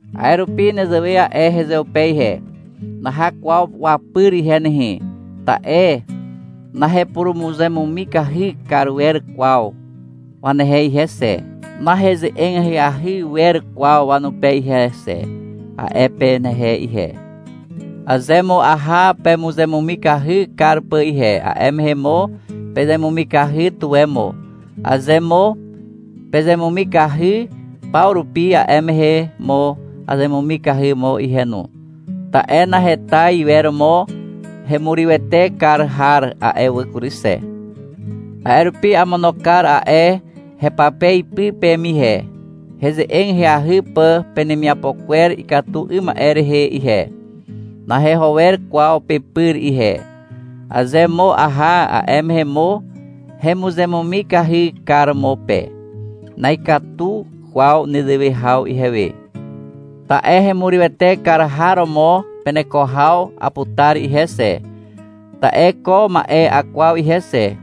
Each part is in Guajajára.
A'e rupi nezewe a'e hezeupe ihe. — Naha kwaw wapyr ihe nehe, ta'e nahepurumuzemumikahy kar wer kwaw wanehe ihe xe, naheze'eg ahyahy wer kwaw wanupe ihe xe, a'e penehe ihe. Aze mo aha pemuzemumikahy kar pà ihe, a'e mehe mo pezemumikahy tuwe mo. Aze mo pezemumikahy paw rupi, a'e mehe mo azemumikahy mo ihe no, ta'e naheta iwer mo hemurywete kar har a'e wà kury xe. A'e rupi amono kar a'e hepape ipy peme ihe, heze'eg ahyahy pà penemiapo kwer ikatu 'ym ma'e rehe ihe. Naheho wer kwaw pepyr ihe. Aze mo aha, a'e mehe mo hemuzemumikahy kar mo pe. Na'ikatu kwaw nezewe haw ihewe. Ta'e hemurywete kar har romo peneko haw aputar ihe xe. Ta'e ko ma'e akwaw ihe xe.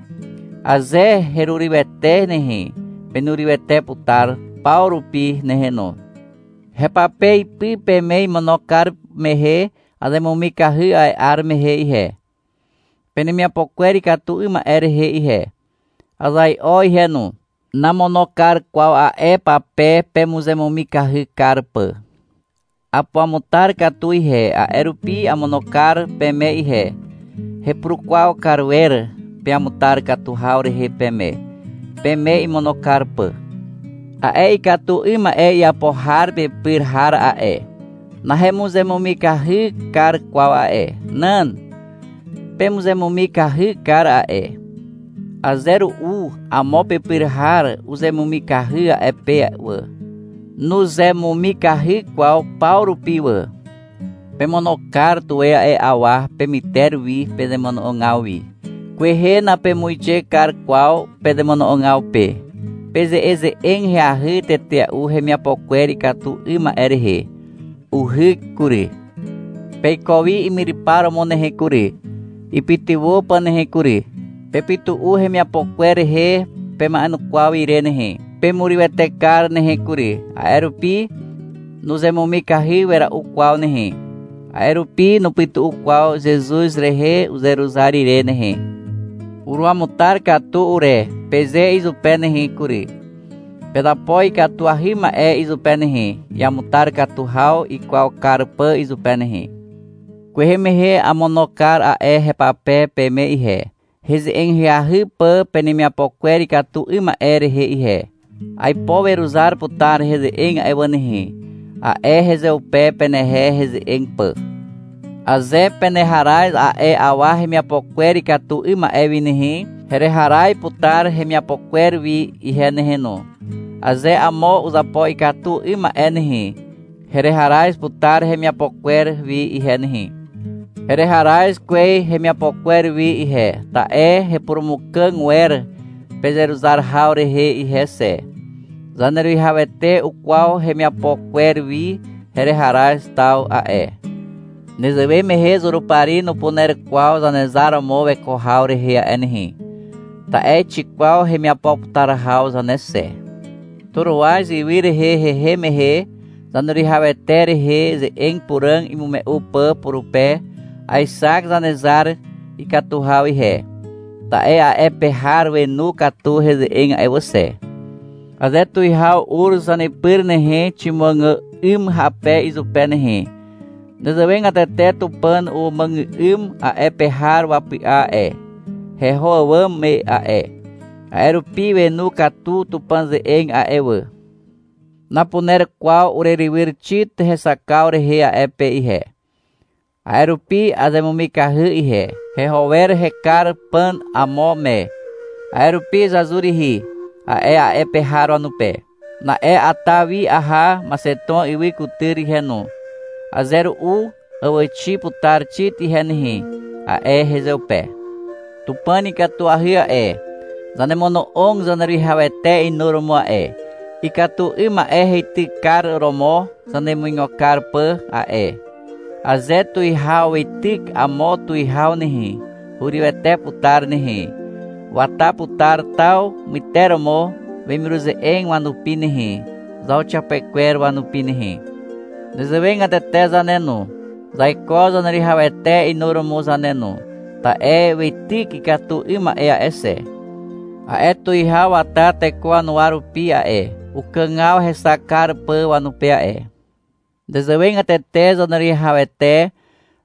Aze herurywete nehe, penurywete putar paw rupi nehe no. Hepape ipy peme imono kar mehe azemumikahy a'e 'ar mehe ihe, penemiapo kwer ikatu 'ym ma'e rehe ihe. Azai'o ihe no. Namono kar kwaw a'e pape pemuzemumikahy kar pà. Apuamutar katu ihe, a'e rupi amono kar peme ihe. Hepurukwaw kar wer peamutar katu haw rehe peme, peme imono kar pà. A'e ikatu 'ym ma'e iapo har pepyr har a'e, nahemuzemumikahy kar kwaw a'e. Nan. Pemuzemumikahy kar a'e. Aze ru'u amo pepyr har uzemumikahy a'e pe wà. Nuzemumikahy kwaw paw rupi wà. Pemono kar tuwe a'e awa pemyter wi pezemono'ogaw wi. Kwehe napemuixe kar kwaw pezemono'ogaw pe. Peze'eze'eg ahyahy tetea'u hemiapo kwer ikatu 'ym ma'e rehe. Uhyk kury. Peiko wi imyrypar romo nehe kury, ipytywà pà nehe kury. Pepytu'u hemiapo kwer rehe pema'enukwaw ire nehe. Pemurywete kar nehe kury. A'e rupi nuzemumikahy wera'u kwaw nehe. A'e rupi nupytu'u kwaw Zezuz rehe uzeruzar ire nehe. — Uruamutar katu ure, peze izupe nehe kury. Pezapo ikatuahy ma'e izupe nehe, iamutar katu haw ikwaw kar pà izupe nehe. Kwehe mehe amono kar a'e hepape peme ihe, heze'eg ahyahy pà penemiapo kwer ikatu 'ym ma'e rehe ihe. -Aipo weruzar putar heze'eg a'e wà nehe, a'e hezeupe, penehe heze'eg pà. Aze peneharaz a'e awa hemiapo kwer ikatu 'ym ma'e wi nehe, hereharaz putar hemiapo kwer wi ihe nehe no. Aze amo uzapo ikatu 'ym ma'e nehe, hereharaz putar hemiapo kwer wi ihe nehe. Hereharaz kwez hemiapo kwer wi ihe, ta'e hepurumukàg wer pezeruzar haw rehe ihe xe. Zaneruwihawete ukwaw hemiapo kwer wi hereharaz taw a'e. Nezewe mehe Zurupari nupuner kwaw zanezar romo weko haw rehe a'e nehe. Ta'e xikwaw hemiapo putar haw zane xe. Toroaz ywy rehe hehem mehe, Zaneruwihawete rehe ze'eg puràg imume'u pà purupe, aexak Zanezar ikatu haw ihe. Ta'e a'e pe har wenu katu heze'eg a'e wà xe. Aze tuwihaw ur zanepyr nehe, ximuàgà'ym hape izupe nehe. Nezewegatete Tupàn umuàgà'ym a'e pe har wapy'a a'e, heho àwàm me a'e. A'e rupi wenu katu Tupàn ze'eg a'e wà. Napuner kwaw urerywyr Xit hexakaw rehe a'e pe ihe. A'e rupi azemumikahy ihe. Heho wer hekar pà amo me. A'e rupi, — Zazur rihi, a'e a'e pe har wanupe. Na'e ata wi aha Maxeton ywy kutyr ihe no. — Aze ru'u àwàxi putar Xit ihe nehe, a'e hezeupe. Tupàn ikatuahy a'e. Zanemono'og Zaneruwihawete inuromo a'e, ikatu 'ym ma'e heitykar romo zanemuigo kar pà a'e. Aze tuwihaw weityk amo tuwihaw nehe, hurywete putar nehe, wata putar taw myteromo wemiruze'eg wanupi nehe, zauxiapekwer wanupi nehe. Nezewegatete zane no, zaiko Zaneruwihawete inuromo zane no, ta'e weityk ikatu 'ym ma'e a'e xe. A'e tuwihaw wata teko wanuwa rupi a'e, ukàgaw hexak kar pà wanupe a'e. Nezewegatete Zaneruwihawete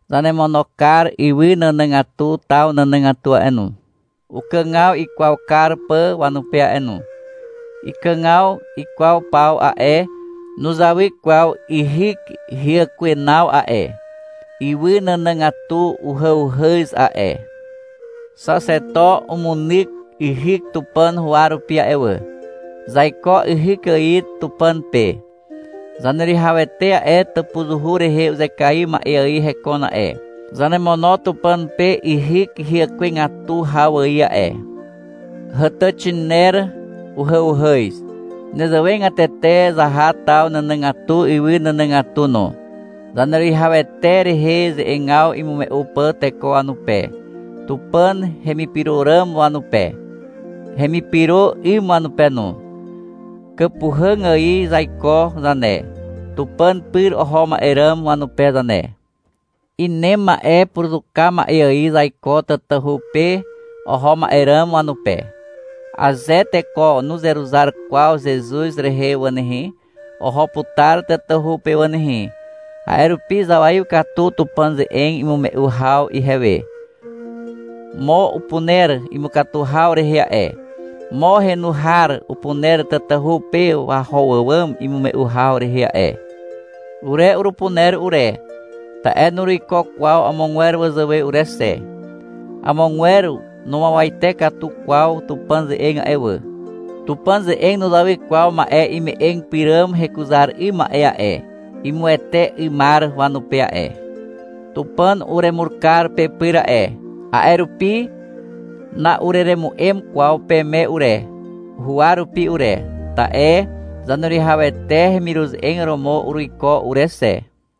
zanemono kar ywy nànàgatu taw nànàgatu a'e no, ukàgaw ikwaw kar pà wanupe a'e no. Ikàgaw ikwaw paw a'e, nuzawy kwaw yhyk hyàkwenaw a'e. Ywy nànàgatu uhàuhàz a'e. Xaxeto umunyk yhyk Tupàn huwa rupi a'e wà. Zaiko yhyk ài Tupàn pe. Zaneruwihawete a'e, tàpuzuhu rehe uzekaiw ma'e ài hekon a'e. Zanemono Tupàn pe yhyk hyàkwegatu haw ài a'e. Hàtàxiner uhàuhàz. Nezewegatete zaha taw nànàgatu ywy nànàgatu no, Zaneruwihawete rehe ze'egaw imume'u pà teko wanupe, Tupàn hemipyro ràm wanupe, hemipyro 'ym wanupe no. Kàpuhàg ài zaiko zane, Tupàn pyr oho ma'e ràm wanupe zane. Inem ma'e puruzuka ma'e ài zaiko tatahu pe oho ma'e ràm wanupe. (Aze teko nuzeruzar kwaw Zezuz rehe wà nehe, oho putar tatahu pe wà nehe. A'e rupi zawaiw katu Tupàn ze'eg imume'u haw ihewe.) Mo upuner imukatu haw rehe a'e. Mo henu har upuner tatahu pe waho àwàm imume'u haw rehe a'e. Ure urupuner ure, ta'e nuruiko kwaw amogwer wazàwe ure xe. Amogwer numuawate katu kwaw Tupàn ze'eg a'e wà. Tupàn ze'eg nuzawy kwaw ma'e ime'eg pyràm hekuzar 'ym ma'e a'e, imuwete 'ymar wanupe a'e. Tupàn uremur kar pepyr a'e. A'e rupi na'ureremu'em kwaw peme ure, huwa rupi ure, ta'e Zaneruwihawete hemiruze'eg romo uruiko ure xe.